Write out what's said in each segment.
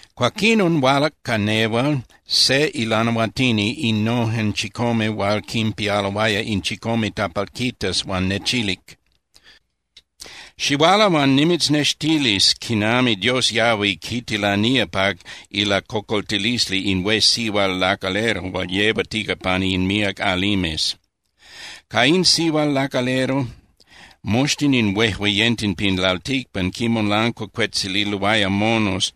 Cuaquinon hualac ca nehual se ilanahuatini innojen chicome hual quinpialoaya in chicome tapalquitas huan nechilic: —Xihuala huan nimitznextilis quinami Dios yahui quitilanía pa ilacocoltilisli in hué sihual lacalero hual yehuatica pani in míac alimes. Ca in sihual lacalero, moxtin in huejueyenten pin lalticpan quinmolancuacuetzililoaya monos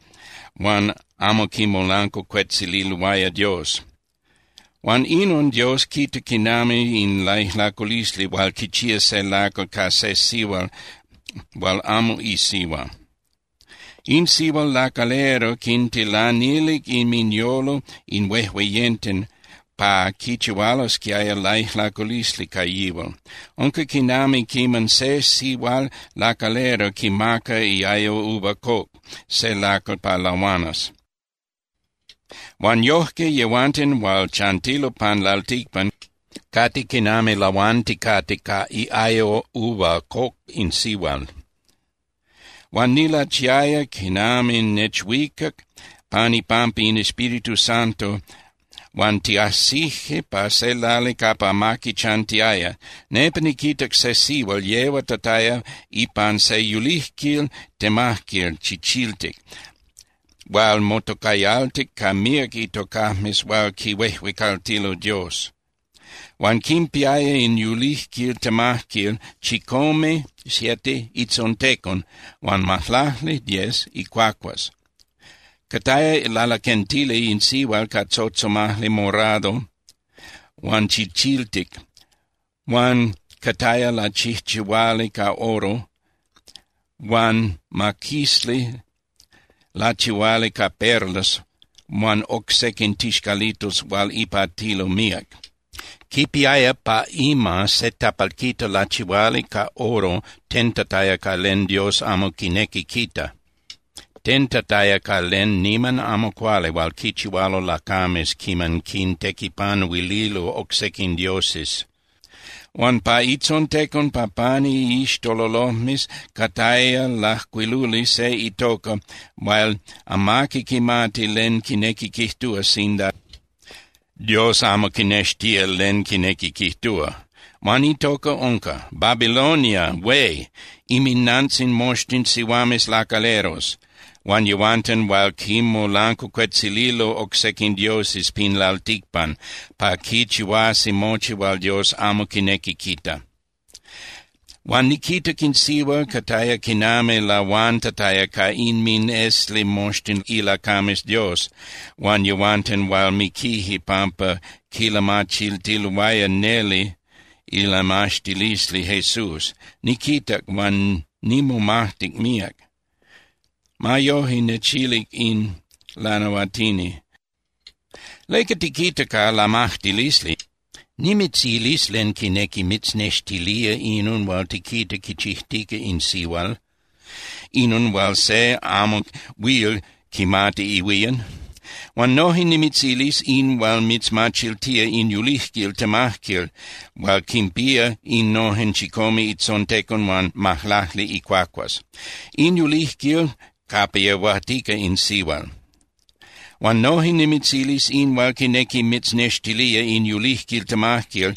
huan amo quimolancuacuetzililoaya Dios. Huan inon Dios quita quinami in laijlaculisli hual quichía se lacal ca se sihual hual amo isihua. In sihual lacalero quintilanilic inminyolo in huejueyenten pa quichihualosquiaya laijlaculisli ca yihual. Unca quinami quiman se sihual lacalero quimaca iayo uva coc se lacal pa lahuanas. Huan yojque yehuanten hual chantilo pan lalticpan cate quinami lahuanticate ca iayo uva coc in sihual. Huan nilachiaya quinami nechuicac pan ipampa in Espíritu Santo huan tiajsije pa se lali capa amaqui chantiaya. Nepa niquitac se sihual yehuatataya ipan se yulijquil temajquil chichiltic hual motocayaltic ca míac itocajmes hual quihuejuecaltilo Dios. Huan quinpiaya in yulijquil temajquil chicome (siete) itzontecon huan majlacli (diez) icuacuas. Cataya lalaquentili in sihual ca tzotzomajli morado huan chichiltic huan cataya lachijchihuali ca oro huan maquisli lachihuali ca perlas huan oc sequin tixcalitos hual ipatilo míac. Quipiaya pa ima se tapalquita lachihuali ca oro tentataya ca len Dios amo quinequi quita, tentataya ca len niman amo cuali hual quichihualo lacames quiman quintequipanuililo oc sequin dioses. Huan pa itzontecon pa pani iixtololojmes cataya lajcuiluli se itoca hual amaqui quimati len quinequi quijtúa sinda Dios amo quinextía len quinequi quijtúa. Huan itoca unca: “BABILONIA HUÉ, INMINANTZIN MOXTIN SIHUAMES LACALEROS HUAN YEHUANTEN HUAL QUINMOLANCUACUETZILILO OC SEQUIN DIOSES PIN LALTICPAN PA QUICHIHUASQUI MOCHI HUAL DIOS AMO QUINEQUI QUITA.” Huan niquitac in sihual cataya quinami lahuantataya ca inminesli moxtin ilacames Dios huan yehuanten hual miquije pampa quilamachiltiloaya neli ilamaxtilisli Jesús. Niquitac, huan nimomajtic míac. Ma yoje, nechilic in lanahuatini: —¿Leca tiquita ca lamajtilisli? Nimitzilis len quinequi mitznextilía inon hual tiquita quichijtica in sihual, inon hual se amo huil quimati ihuían. Huan noje nimitzilis in hual mitzmachiltía in yulijquil temajquil hual quinpía innojen chicome itzontecon huan majlacli icuacuas, in yulijquil capa yehuatica in sihual. Huan noje nimitzilis in hual quinequi mitznextilía in yulijquil temajquil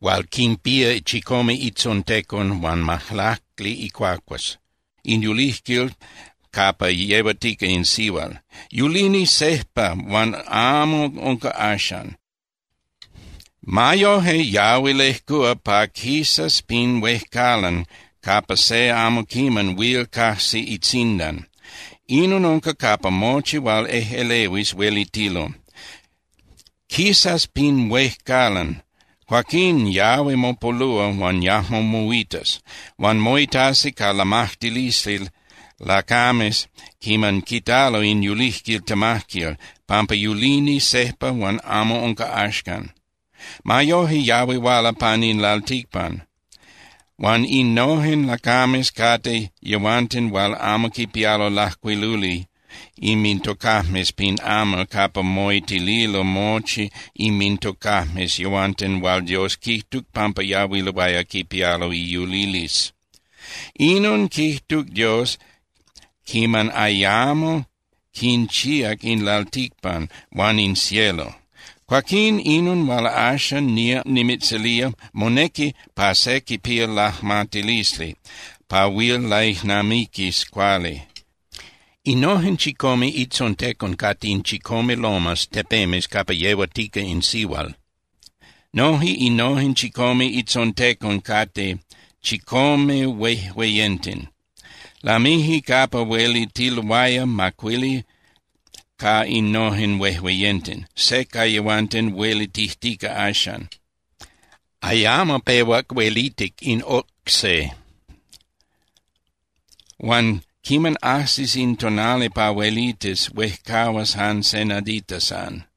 hual quinpía chicome itzontecon huan majlacli icuacuas, in yulijquil capa yehuatica in sihual. Yulini sejpa huan amo unca axan. Ma yoje yahui lejcúa pa quisas pin huejcalan capa se amo quiman huil cajsi itzindan. Inon unca capa mochi hual ejꞌelehuis huelitilo. Quisas pin huejcalan, cuaquín yahui mopolúa huan yajmo moitas. Huan moitasi ca lamajtilisli lacames quiman quitalo in yulijquil temajquil, pampa yulini sejpa huan amo unca axan. Ma yoje yahui huala pan in lalticpan. Huan innojen lacames cate yehuanten hual amo quipialo lajcuiluli inmintocajmes pin amal capa moitililo mochi inmintocajmes yehuanten hual Dios quijtuc pampa yahuiloaya quipialo iyulilisli. Inon quijtuc Dios quiman ayamo quinchíac in lalticpan huan in cielo. ’Cuaquín, inon hual axan nía nimitzilía, monequi pa se quipía lajmatilisli pa huil laijnamiquis cuali. Innojen chicome itzontecon cate in chicome lomas (tepemes) capa yehuatica in sihual. Noje innojen chicome itzontecon cate chicome huejueyenten. Lamije capa huelitiloaya macuili ca innojen huejueyenten. Se ca yehuanten huelitijtica axan. Ayamo pehuac huelitic in oc se. Huan quiman ajsis in tonali pa huelitis, huejcahuas jan se nadita san.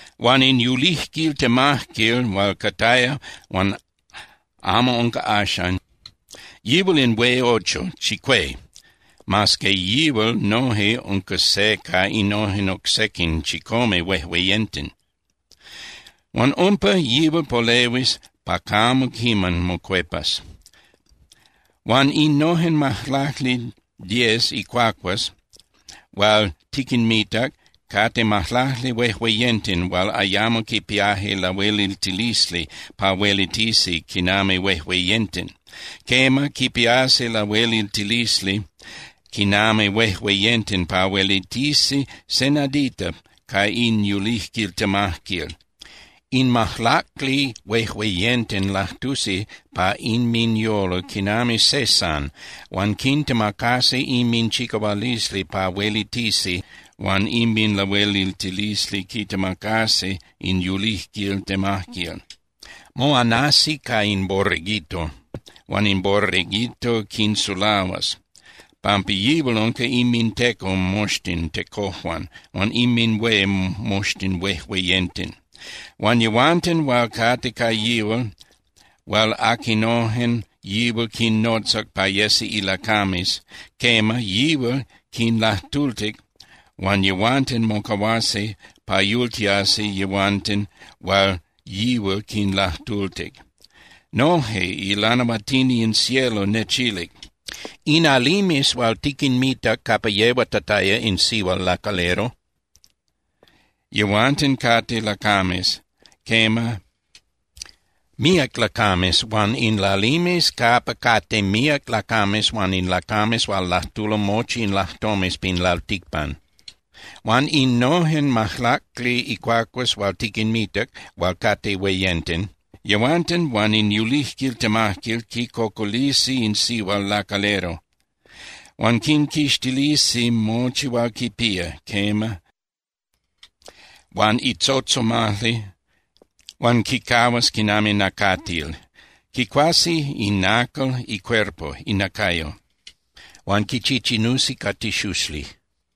Huan in yulijquil temajquil hual cataya huan amo unca axan, yihual in hué ocho (chicué), mas que yihual noje unca se ca innojen oc sequin chicome huejueyenten. Huan umpa, yihual polehuis pa camo quiman mocuepas. ’Huan innojen majlacli (diez) icuacuas hual tiquinmitac cate majlacli huejueyenten hual ayamo quipiaje lahueliltilisli pa huelitisi quinami huejueyenten. Quema, quipiasi lahueliltilisli quinami huejueyenten pa huelitisi se nadita ca in yulijquil temajquil. In majlacli huejueyenten lajtusi pa inminyolo quinami se san huan quintemacasi inminchicahualisli pa huelitisi huan inminlahueliltilisli quitemacasi in yulijquil temajquil. Moanasi ca in Borreguito, huan in Borreguito quinsulahuas, pampa yihual unca inminteco moxtin tecojuan huan inminhué moxtin huejueyenten. Huan yehuanten hual cate ca yihual, hual aquinojen yihual quinnotzac pa yesi ilacames, quema, yihual quinlajtultic huan yehuanten mocahuasi pa yultiasi yehuanten hual yihual quinlajtultic. Noje ilanahuatini in cielo nechilic: —In alimes hual tiquinmitac capa yehuatataya in sihual lacalero, yehuanten cate lacames, quema, míac lacames huan in lalimes capa cate míac lacames huan in lacames hual lajtulo mochi in lajtomes pin lalticpan. Huan innojen majlacli icuacuas hual tiquinmitac hual cate hueyenten, yehuanten huan in yulijquil temajquil quicocolisi in sihual lacalero. Huan quinquixtilisi mochi hual quipía, quema, huan itzotzomajli, huan quicahuas quinami nacatil. Quicuasi inacal icuerpo (inacayo) huan quichichinusi ca tixuxli.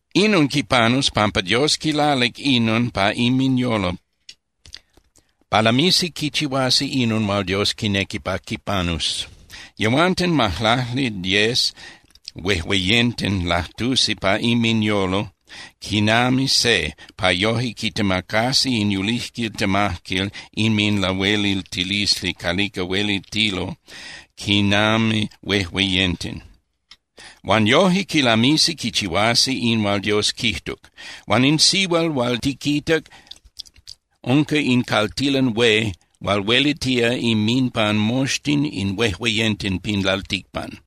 Inon quipanus pampa Dios quilalic inon pa inminyolo pa lamisi quichihuasi inon hual Dios quinequi pa quipanus. Yehuanten majlacli (diez) huejueyenten lajtusi pa inminyolo quinami se pa yoje quitemacasi in yulijquil temajquil inminlahueliltilisli calica huelitilo quinami huejueyenten. Huan yoje quilamisi quichihuasi in hual Dios quijtuc. Huan in sihual hual tiquitac unca in caltilan hué hual huelitía inminpan moxtin in huejueyenten pin lalticpan.